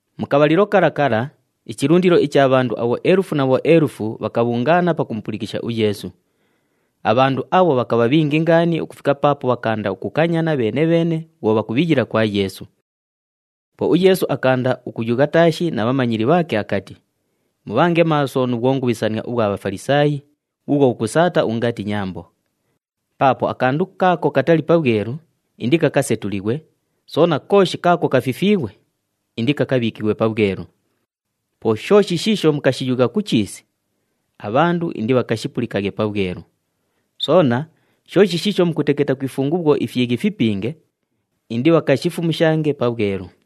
Mu kabhalilo kala kala, ichilundilo icha bhandu abhoelufu na bhoelufu bhakabhungaana pakumupulikisha uYeesu. Abhandu abho bhakabha bhingi ngaani ukufika paapo bhakaanda ukukanyana bheene-bheene bhwo bhakubhiyila kwa Yeesu. Po uYeesu akaanda ukuyugha taashi na bhamanyili bhaake akati, “Mubhange maaso nu bhwongubhisania ubhwa Bhafalisaayi, bhuubhwo bhukusaata ungati nyambo. Paapo akandu kaako katali pabhwelu, indikakasetulighwe, soona kooshi kaako kafifiighwe, indikakabhiikighwe pabhwelu. Po shooshi shiisho mukashiyugha ku chiisi, abhandu indibhakashipulikaghe pabhwelu. Soona shooshi shiisho mukuteketa ku ifungu bhwo ifyighi fipinge, indibhakashifumushange pabhwelu.”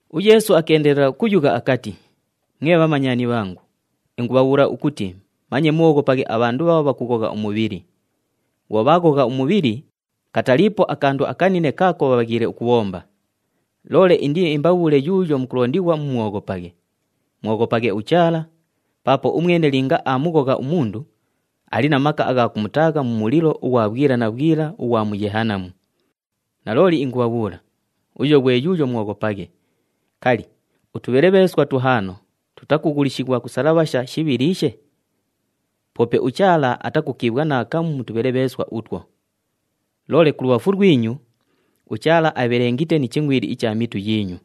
UYeesu akeendelela ukuyugha akati, “Mwe bhamanyani bhangu, ingubhabhuula ukuti manye mubhooghopaghe abhandu bhaabho bhakughogha umubhili. Bhwo bhaaghogha umubhili, kataliipo akandu akanine kaako bhabhaghiile ukubhomba. Loole indiimbabhuule yuuyo mukulondighwa mumwoghopaghe. Mwoghopaghe uChaala, paapo umwene linga aamughogha umundu, ali na maka agha kumutaagha mu mulilo ughwa bhwila na bhwila ughwa mu Yehanamu. Nalooli ingubhabhuula, uyo ghwe yuuyo mwoghopaghe. Kali, utubhelebheeswa tuhaano tutakughulishighwa ku salabhasha shibhiliishe? Poope uChaala atakukiibhwa naakamu mu tubhelebheeswa utwo. Loole kulubhafu lwinyu, uChaala abhelengite ni chingʼwili icha mitu yiinyu.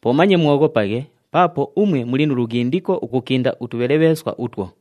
Po manye mwoghopaghe paapo umwe muli nu lughindiko ukukinda utubhelebheeswa utwo.”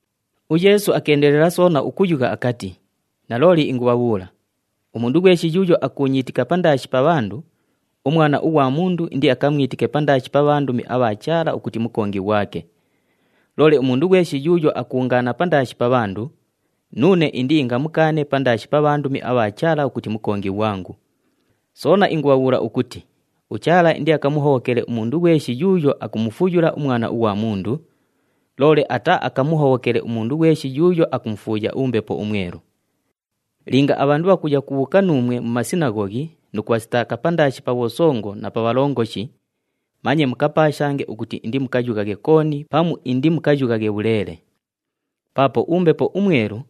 UYeesu akeendelela soona ukuyugha akati, “Nalooli ingubhabhuula, umundu ghweshi yuuyo akuunyiitika pandaashi pa bhandu, uMwana ughwa Mundu indiakamwitike pandaashi pa bhandumi abha Chaala ukuti mukongi ghwake. Loole umundu ghweshi yuuyo akuungaana pandaashi pa bhandu, nuune indiingamukaane pandaashi pa bhandumi abha Chaala ukuti mukongi ghwangu. Soona ingubhabhuula ukuti uChaala indiakamuhobhokele umundu ghweshi yuuyo akumufuyula uMwana ughwa Mundu, loole ataaakamuhobhokele umundu ghweshi yuuyo akumufuuya uMbepo uMwelu. “Linga abhandu bhakuya kubhuuka nuumwe mu masinaghoghi nu kubhasitaaka pandaashi pa bhosongo na pa bhalongoshi, manye mukapaashange ukuti indimukayughaghe kooni pamu indimukayughaghe bhuleele. Paapo uMbepo uMwelu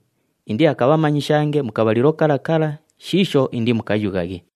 indiakabhamanyishange mu kabhalilo kala kala shiisho indimukayughaghe.”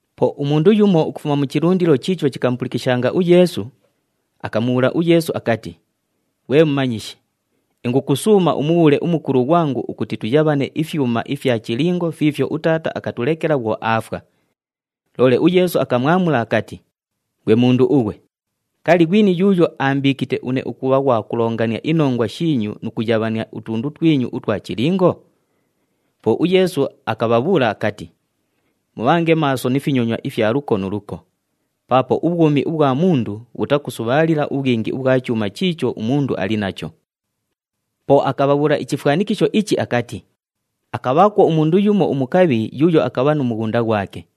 Po umundu yumo ukufuma mu chilundilo chiicho chikamupulikishanga uYeesu, akamubhuula uYeesu akati, “Ghwe Mumanyishi, ingukusuuma umubhuule umukulu ghwangu ukuti tuyabhane ifyuma ifya chilingo fiifyo utaata akatulekela bhwo aafwa.” Loole uYeesu akamwamula akati, “Ghwe mundu ughwe, kali, ghwini yuuyo aambiikite une ukubha ghwa kulongania inongwa shiinyu nu kuyabhania utundu twinyu utwa chilingo?” Po uYeesu akabhabhuula akati, “Mubhange maaso ni finyonywa ifya luko nu luko, paapo ubhwumi ubhwa mundu bhutakusubhaalila ubhwingi ubhwa chuuma chiicho umundu ali nacho.” Po akabhabhuula ichifwanikisho ichi akati, “Akabhaakwo umundu yumo umukabhi yuuyo akabha nu mughunda ghwake.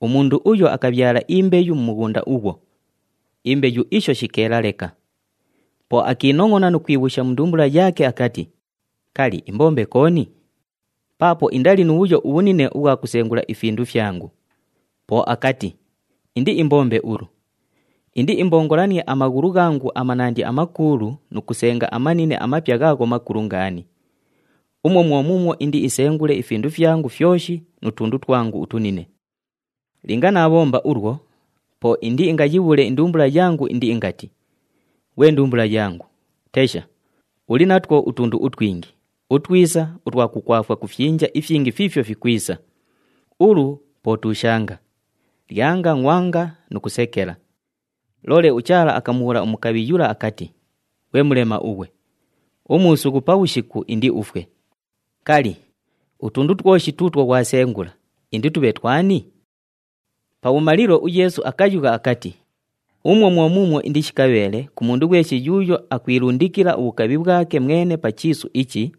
Umundu uyo akabhyala imbeyu mu mughunda ughwo, imbeyu isho shikeela leka. Po akiinongʼona nu kwibhuusha mu ndumbula yaake akati, ‘Kali, imbombe kooni? Paapo indali nu bhuyo ubhunine ubhwa kusengula ifindu fyangu.’ Po akati, ‘Indiimbombe ulu, indiimbongolanie amaghulu ghangu amanandi amakuulu nu kusenga amanine amapya ghaagho makulu ngaani. Umwo mwo muumwo indiisengule ifindu fyangu fyoshi nu tundu twangu utunine. Linga naabhomba ulwo, po indiingayiibhuule indumbula yangu indiingati, “Ghwe ndumbula yangu, tesha, uli natwo utundu utwingi, utwisa, utwa kukwafwa ku fyinja ifyingi fiifyo fikwisa. Ulu po tuushanga, lyanga, ngʼwanga nu kusekela.” ’ Loole uChaala akamubhuula umukabhi yula akati, ‘Ghwe mulema ughwe! Umuusughu pabhushiku indiufwe! Kali, utundu twoshi tuutwo ghwasengula inditubhe twani?’” Pabhumalilo uYeesu akayugha akati, “Umwo mwo muumwo indishikabheele ku mundu ghweshi yuuyo akwilundikila ubhukabhi bhwake mwene pa chiisu ichi,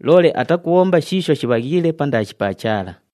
loole atakubhomba shiisho shibhaghiile pandaashi pa Chaala.”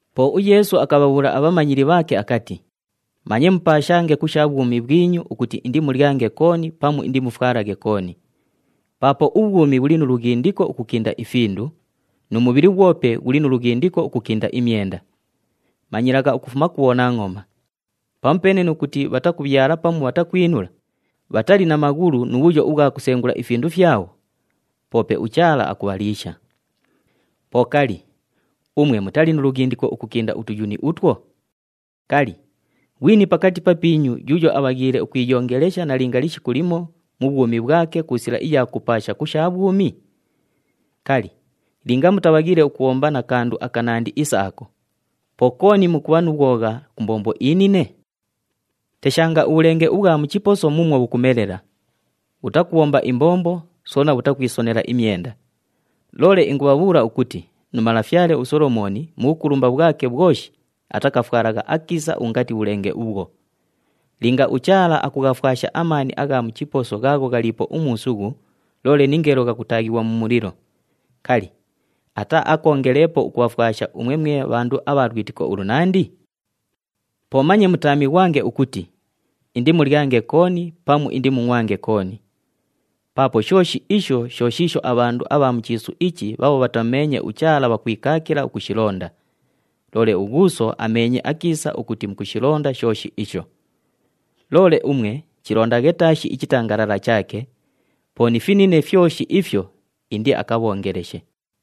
Po uYeesu akabhabhuula abhamanyili bhaake akati, “Manye mupaashange ku sha bhwumi bhwinyu ukuti indimulyange kooni pamu indimufwalaghe kooni. Paapo ubhwumi bhuli nu lughindiko ukukinda ifindu, nu mubhili ghwope ghuli nu lughindiko ukukinda imyenda. Manyilagha ukufuma ku bhonangʼoma! Pamupeene nu kuti bhatakubhyala pamu bhatakwinula, bhatali na maghulu nu bhuyo ubhwa kusengula ifindu fyabho, poope uChaala akubhaliisha. Po kali, umwe mutali nu lughindiko ukukinda utuyuni utwo? Kali, ghwini pakati papiinyu yuuyo abhaghiile ukwiyongelesha nalinga lishiku limo mu bhwumi bhwake ku sila iya kupaasha ku sha bhwumi? Kali, linga mutabhaghiile ukubhomba na kandu akanandi isa ako, po kooni mukubha nu bhwogha ku mbombo inine? “Teshanga ubhulenge ubhwa mu chiposo muumwo bhukumelela! Bhutakubhomba imbombo, soona bhutakwisonela imyenda. Loole ingubhabhuula ukuti nu malafyale uSolomooni mu bhukulumba bhwake bhwoshi atakafwalagha akiisa ungati bhulenge ubhwo! Linga uChaala akughafwasha amaani agha mu chiposo ghaagho ghaliipo umuusughu loole ningeelo ghakutaaghighwa mu mulilo, kali, ataaakoongeleepo ukubhafwasha umwe mwe bhandu abha lwitiko ulunandi? “Po manye mutaamighwange ukuti, ‘Indimulyange kooni pamu indimungʼwange kooni.’ Paapo shooshi isho sho shiisho abhandu abha mu chiisu ichi bhaabho bhatamumeenye uChaala bhakwikaakila ukushilonda, loole uGhuuso ameenye akiisa ukuti mukushilonda shooshi isho. Loole umwe chilondaghe taashi ichitangalala chaake, po ni finine fyoshi ifyo indiakabhoongeleshe.”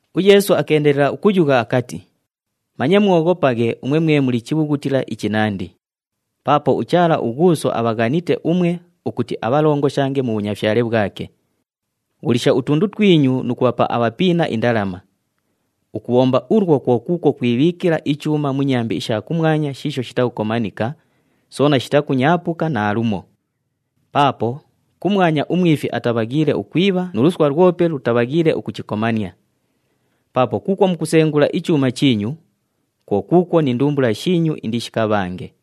UYeesu akeendelela ukuyugha akati, “Manye mwoghopaghe umwe mwe muli chibhughutila ichinandi. Paapo uChaala uGhuuso abhaghanite umwe ukuti abhalongoshange mu bhunyafyale bhwake. Ghulisha utundu twinyu nu kubhapa abhapiina indalama. Ukubhomba ulwo kwo kuukwo kwibhiikila ichuuma mu nyambi isha kumwanya shiisho shitakukomanika, soona shitakunyaapuka naalumo. Paapo kumwanya umwifi atabhaghiile ukwibha nu luswa lwope lutabhaghiile ukuchikomania. Paapo kuukwo mukusengula ichuuma chiinyu, kwo kuukwo ni ndumbula shiinyu indishikabhange.”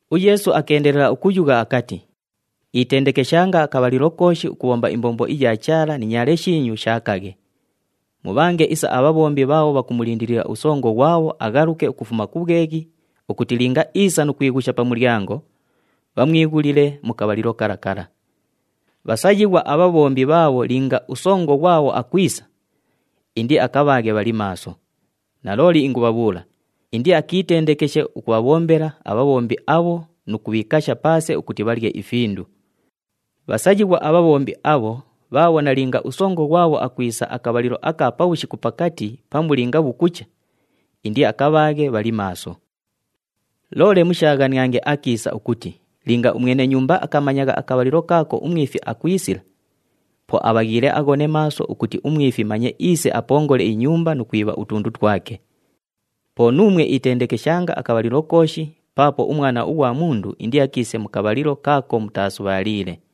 UYeesu akeendelela ukuyugha akati, “Itendekeshanga akabhalilo kooshi ukubhomba imbombo iya Chaala ni nyaale shiinyu shaakaghe. Mubhange isa abhabhombi bhaabho bhakumulindilila usongo ghwabho aghaluke ukufuma ku bhweghi ukuti linga iisa nu kwighusha pa mulyango, bhamwighulile mu kabhalilo kala kala. Bhasayighwa abhabhombi bhaabho linga usongo ghwabho akwisa, indiakabhaaghe bhali maaso. Nalooli ingubhabhuula, indiakiitendekeshe ukubhabhombela abhabhombi abho nu kubhiikasha paase ukuti bhalye ifindu. Bhasayighwa abhabhombi abho bhaabho nalinga usongo ghwabho akwisa akabhalilo aka pabhushiku pakati pamu linga bhukucha, indiakabhaaghe bhali maaso. “Loole mushaaghaniange akiisa ukuti linga umwene nyumba akamanyagha akabhalilo kaako umwifi akwisila, po abhaghiile aghone maaso ukuti umwifi manye iise apongole inyumba nu kwibha utundu twake. Po nuumwe itendekeshanga akabhalilo kooshi paapo uMwana ughwa Mundu indiakiise mu kabhalilo kaako mutaasubhaaliile.”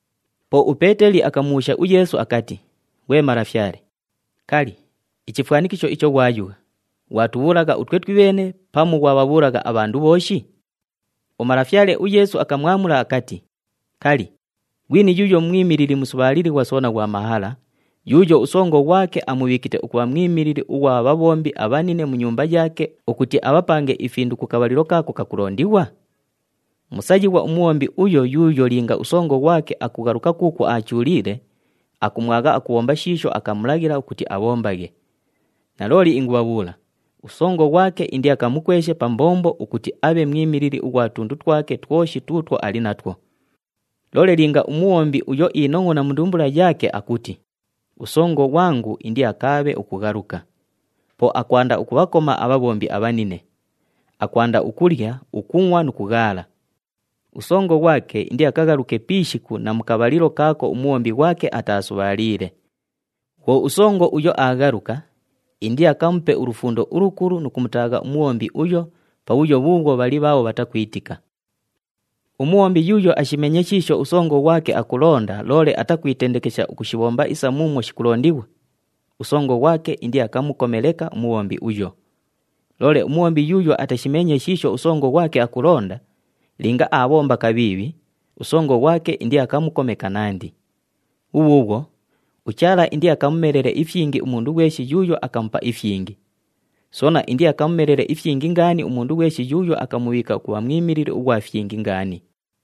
Po uPeeteli akamubhuusha uYeesu akati, “Ghwe Malafyale, kali, ichifwanikisho icho ghwayugha, ghwatubhuulagha utwe twibheene pamu ghwabhabhuulagha abhandu bhooshi?” UMalafyale uYeesu akamwamula akati, “Kali, ghwini yuuyo mwimilili musubhaalilighwa soona ghwa mahala, yuuyo usongo ghwake amubhiikite ukubha mwimilili ughwa bhabhombi abhanine mu nyumba yaake ukuti abhapange ifindu ku kabhalilo kaako kakulondighwa? Musayighwa umubhombi uyo yuuyo linga usongo ghwake akughaluka kuukwo aachuuliile, akumwagha akubhomba shiisho akamulaghila ukuti abhombaghe. Nalooli ingubhabhuula, usongo ghwake indiakamukweshe pa mbombo ukuti abhe mwimilili ughwa tundu twake twoshi tuutwo ali natwo. Loole linga umubhombi uyo iinongʼona mu ndumbula yaake akuti, ‘Usongo ghwangu indiakaabhe ukughaluka.’ Po akwanda ukubhakoma abhabhombi abhanine. Akwanda ukulya, ukungʼwa nu kughaala. Usongo ghwake indiakaghaluke pi ishiku na mu kabhalilo kaako umubhombi ghwake ataasubhaaliile. Bhwo usongo uyo aaghaluka, indiakamupe ulufundo ulukulu nu kumutaagha umubhombi uyo pabhuyo bhuubhwo bhali bhaabho bhatakwitika. “Umubhombi yuuyo ashimeenye shiisho usongo ghwake akulonda loole atakwitendekesha ukushibhomba isa muumwo shikulondighwa, usongo ghwake indiakamukome leka umubhombi uyo. Loole umubhombi yuuyo atashimeenye shiisho usongo ghwake akulonda, linga aabhomba kabhiibhi, usongo ghwake indiakamukome kanandi. Bhubhuubhwo uChaala indiakamumelele ifyingi umundu ghweshi yuuyo akamupa ifyingi, soona indiakamumelele ifyingi ngaani umundu ghweshi yuuyo akamubhiika ukubha mwimilili ughwa fyingi ngaani.”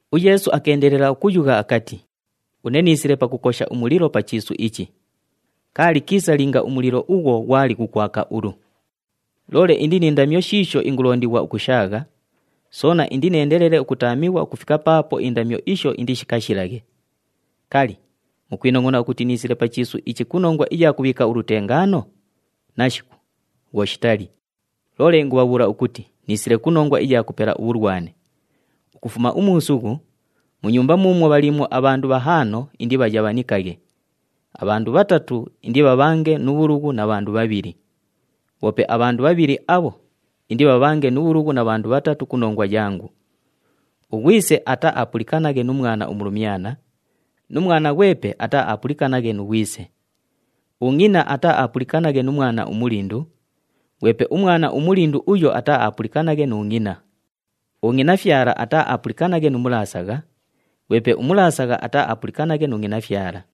UYeesu akeendelela ukuyugha akati, “Une niisile pakukosha umulilo pa chiisu ichi. Kaali kiisa linga umulilo ughwo ghwali ghukwaka ulu! Loole indi ni ndamyo shiisho ingulondighwa ukushaagha, soona indineendelele ukutaamighwa ukufika paapo indamyo isho indishikashilaghe. Kali, mukwinongʼona ukuti niisile pa chiisu ichi ku nongwa iya kubhiika ulutengaano? Nashiku! Bhwo shitali. Loole ingubhabhuula ukuti niisile ku nongwa iya kupela ubhulwane. Ukufuma umuusughu, mu nyumba muumwo bhaliimwo abhandu bhahaano indibhayabhanikaghe. Abhandu bhatatu indibhabhange nu bhulughu na bhandu bhabhili. Bhoope abhandu bhabhili abho indibhabhange nu bhulughu na bhandu bhatatu ku nongwa yangu. Ughwise ataaapulikanaghe nu mwana umulumyana, nu mwana ghwepe ataaapulikanaghe nu ghwise. Ungʼina ataaapulikanaghe nu mwana umulindu, ghwepe umwana umulindu uyo ataaapulikanaghe nu ngʼina. Ungʼinafyala ataaapulikanaghe nu mulaasagha, ghwepe umulaasagha ataaapulikanaghe nu ngʼinafyala.”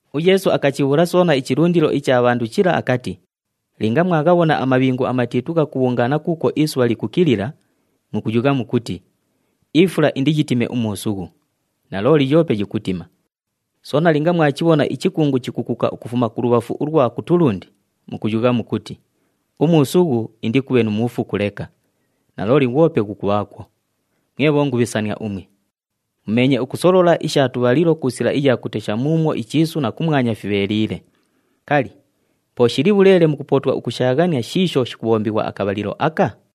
UYeesu akachibhuula soona ichilundilo icha bhandu chila akati, “Linga mwaghabhona amabhingu amatiitu ghakubhungaana kuukwo isubha likukilila, mukuyugha mukuti, ‘Ifula indiyitime umuusughu,’ nalooli yoope yikutima. Soona linga mwachibhona ichikungu chikukuka ukufuma kulubhafu ulwa kutulundi, mukuyugha mukuti, ‘Umuusughu indikubhe nu muufuku leka,’ nalooli ghwope ghukubhaakwo. Mwe bhongubhisania umwe! Mumeenye ukusolola isha tubhalilo ku sila iya kutesha muumwo ichiisu na kumwanya fibheeliile. Kali, po shili bhuleele mukupootwa ukushaaghania shiisho shikubhombighwa akabhalilo aka?”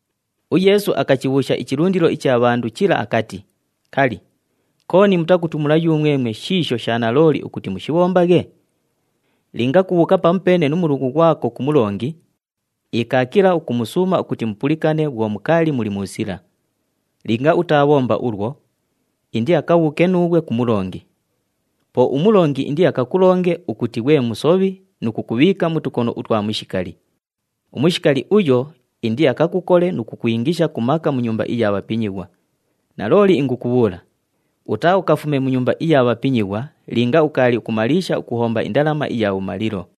UYeesu akachibhuusha ichilundilo icha bhandu chila akati, “Kali, kooni mutakutumula yumwemwe shiisho sha nalooli ukuti mushibhombaghe? Linga kubhuuka pamupeene nu mulughu ghwako ku mulongi, ikaakila ukumusuuma ukuti mupulikane bhwo mukaali muli mu sila. Linga utaabhomba ulwo, indiakabhuuke nuughwe ku mulongi. Po umulongi indiakakulonge ukuti ghwe musobhi nu kukubhiika mu tukono utwa mushikali. Umushikali uyo indiakakukole nu kukwingisha ku maka mu nyumba iya bhapinyighwa. Nalooli ingukubhuula, utaaukafume mu nyumba iya bhapinyighwa linga ukaali ukumaliisha ukuhomba indalama iya bhumalilo.”